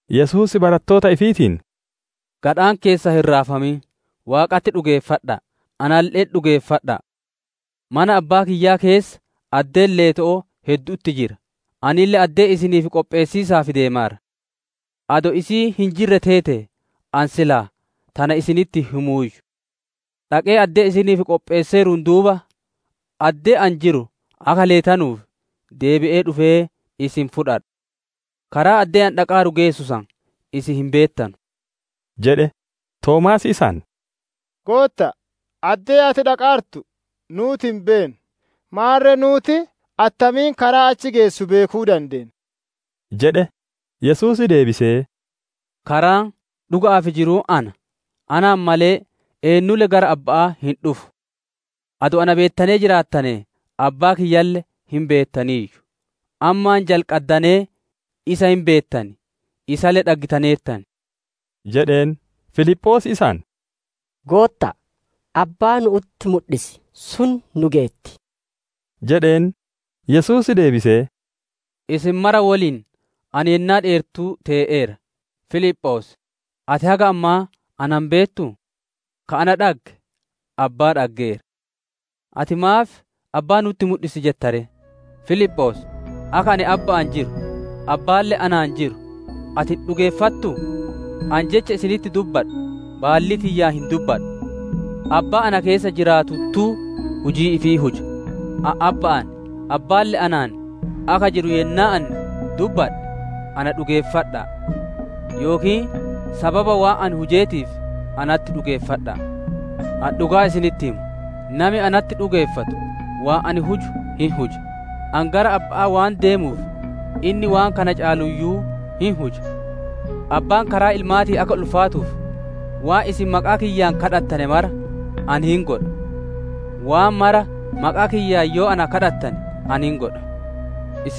Yesuus barattoota ifiitiin, «Gadhaan keessan hin raafamin, Waaqatti dhugeeffadha'a; analle'etti dhugeeffadha'a! Mana Abbaa kiyyaa keessa addeen leeto'oo heddu'utti jira; anille addee isiniif qopheessiisaaf deemaara. Adoo isiin hin jirre teetee ani silaa tana isinitti hin himuuyyu. Dhaqee addee isiniif qopheesseeruun duuba, addee ani jiru akka leetanuuf, deebi'ee dhufee isin fudhadha. Karaa addee ani dhaqaaru geessu san isin hin beettan» jedhe. Toomaas isaan, «Gootta'a, addee ati dhaqaartu nuuti hin beennu; maarre nuuti attamiin karaa achi geessu beekuu dandeenna?» jedhe. Yesuus deebisee, «Karaan, dhuga'aa fi jiruun ana; anaan malee, eennulle gara Abba'aa hin dhufu. Adoo na beettanee jiraattanee Abbaa kiyyalle hin beettaniiyyu. Ammaan jalqaddanee isa hin beettan, isalle dhaggitaneertan» jedheen. Filiphoos isaan, «Gootta'a, Abbaa nu'utti mudhisi; sun nu geetti» jedheen. Yesuus deebisee, «Isin mara woliin ani yennaa dheertuu tee'eera; Filiphoos! Ati haga ammaa na hin beettuu? Ka ana dhagge Abbaa dhaggeera. Ati maaf, ‹Abbaa nu'utti mudhisi› jetta ree? Filiphoos! Akka ani Abba'aan jiru, Abbaalle anaan jiru ati hin dhugeeffattuu? Ani Jecha isinitti dubbadhu, baallii tiyyaan hin dubbadhu. Abbaa, na keessa jiraatuttuu, hujii ifii huja. Ani Abba'aan, Abbaalle anaan akka jiru yennaa ani dubbadhe na dhugeeffadha'a. Yookiin sababa waan Ani hujeetiif natti dhugeeffadha'a. Ani dhugaa isinitti hima: Nami natti dhugeeffatu waan ani huju hin huja; ani gara Abba'aa waan deemuuf inni waan kana caaluuyyuu hin huja. Abbaan karaa Ilmaatiin akka ulfaatuuf, waan isin maqaa kiyyaan gaafattane mara, ani hin godha. Waan mara maqaa kiyyaan yoo na gaafattane, ani hin godha» jedhe.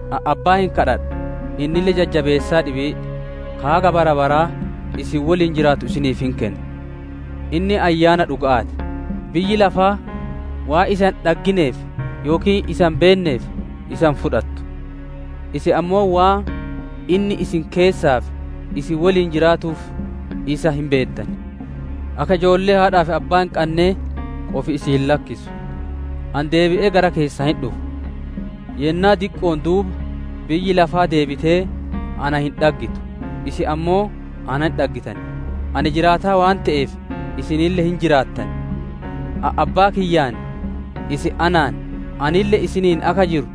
Ani Abbaa hin gaafadha, innille Jajjabeessaa dhibii, ka haga bara baraa isin woliin jiraatu isiniif hin kenna. Inni Ayyaana dhuga'aa ti. Biyyi lafaa waan isa hin dhaggineef yookiin isa hin beenneef, isa hin fudhattu. Isin ammoo waan inni isin keessaa fi isin woliin jiraatuuf, isa hin beettan. «Akka ijoollee haadhaa fi abbaa hin qannee qofi isin hin lakkisu; ani deebi'ee gara keessan hin dhufa. Yennaa diqqo'oon duuba biyyi lafaa deebitee na hin dhaggitu; isin ammoo na hin dhaggitan; ani jiraataa waan te'eef, isinille hin jiraattan. Ani Abbaa kiyyaan, isin anaan, anille isiniin akka jiru,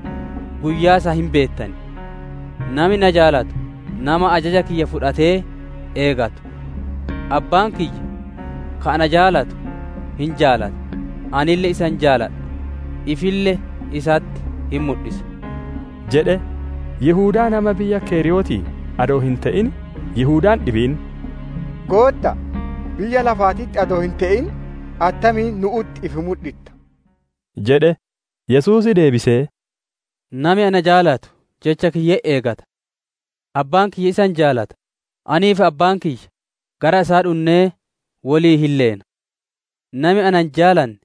guyyaa san hin beettan. «Nami na jaalatu, nama ajaja kiyya fudhatee eegatu. Abbaan kiyya ka ana jaalatu hin jaalata; anille isa hin jaaladha, ifille isatti hin mudhisa» jedhe. Yihudaa nama biyya Keriyootii adoo hin te'in, Yihudaan dhibiin, «Gootta'a, biyya lafaatitti adoo hin te'in, attamiin nu'utti ifi mudhitta?» jedhe. Yesuus deebisee, «Nami na jaalatu Jecha kiyya hin eegata. Abbaan kiyya isa hin jaalata; anii fi Abbaa kiyya gara isaa dhunnee woliin hin leena. Nami na hin jaalanne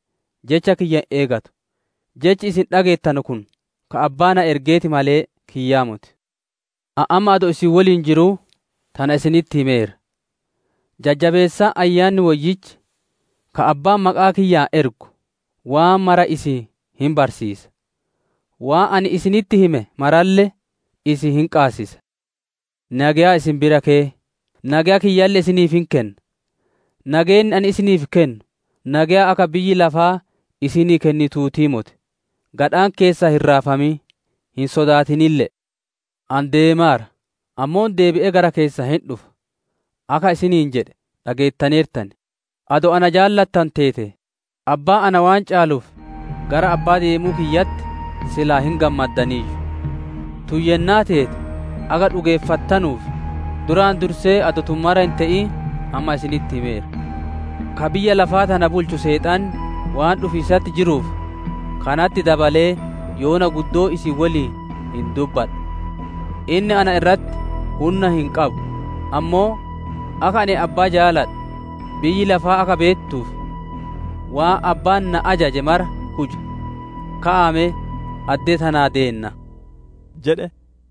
Jecha kiyya hin eegatu. Jechi isin dhageettanu kun, ka Abbaa na ergeeti malee, kiyyaa moti. «Ani amma adoo isin woliin jiruu tana isinitti himeera. Jajjabeessaan Ayyaanni Woyyichi, ka Abbaan maqaa kiyyaan ergu, waan mara isin hin barsiisa; waan ani isinitti hime maralle isin hin qaabachiisa. «Nageya isin bira keya; nageya kiyyalle isiniif hin kenna. Nageenni ani isinii kennu, nageya akka biyyi lafaa isinii kennituutii moti. Gadhaan keessan hin raafamin; hin sodaatinille'e. ‹Ani deemaara, ammoo deebi'ee gara keessan hin dhufa› akka isiniin jedhe dhageettaneertan; adoo na jaalattanu teetee, Abbaan na waan caaluuf, gara Abba'aa deemuu kiyyatti silaa hin gammaddaniiyyu. Tun yennaa teete akka dhugeeffattanuuf, duraan dursee adoo tun mara hin te'in, amma isinitti himeera. Ka biyya lafaa tana bulchu Seexanni waan dhufiisatti jiruuf, kanatti dabalee yoona guddoo isin woliin hin dubbadhu. Inni na irratti hunna hin qabu; ammoo akka ani Abbaa jaaladhu biyyi lafaa akka beettuuf, waan Abbaan na ajaje mara huja; ka'aa me addee tanaa deennaa» jedhe.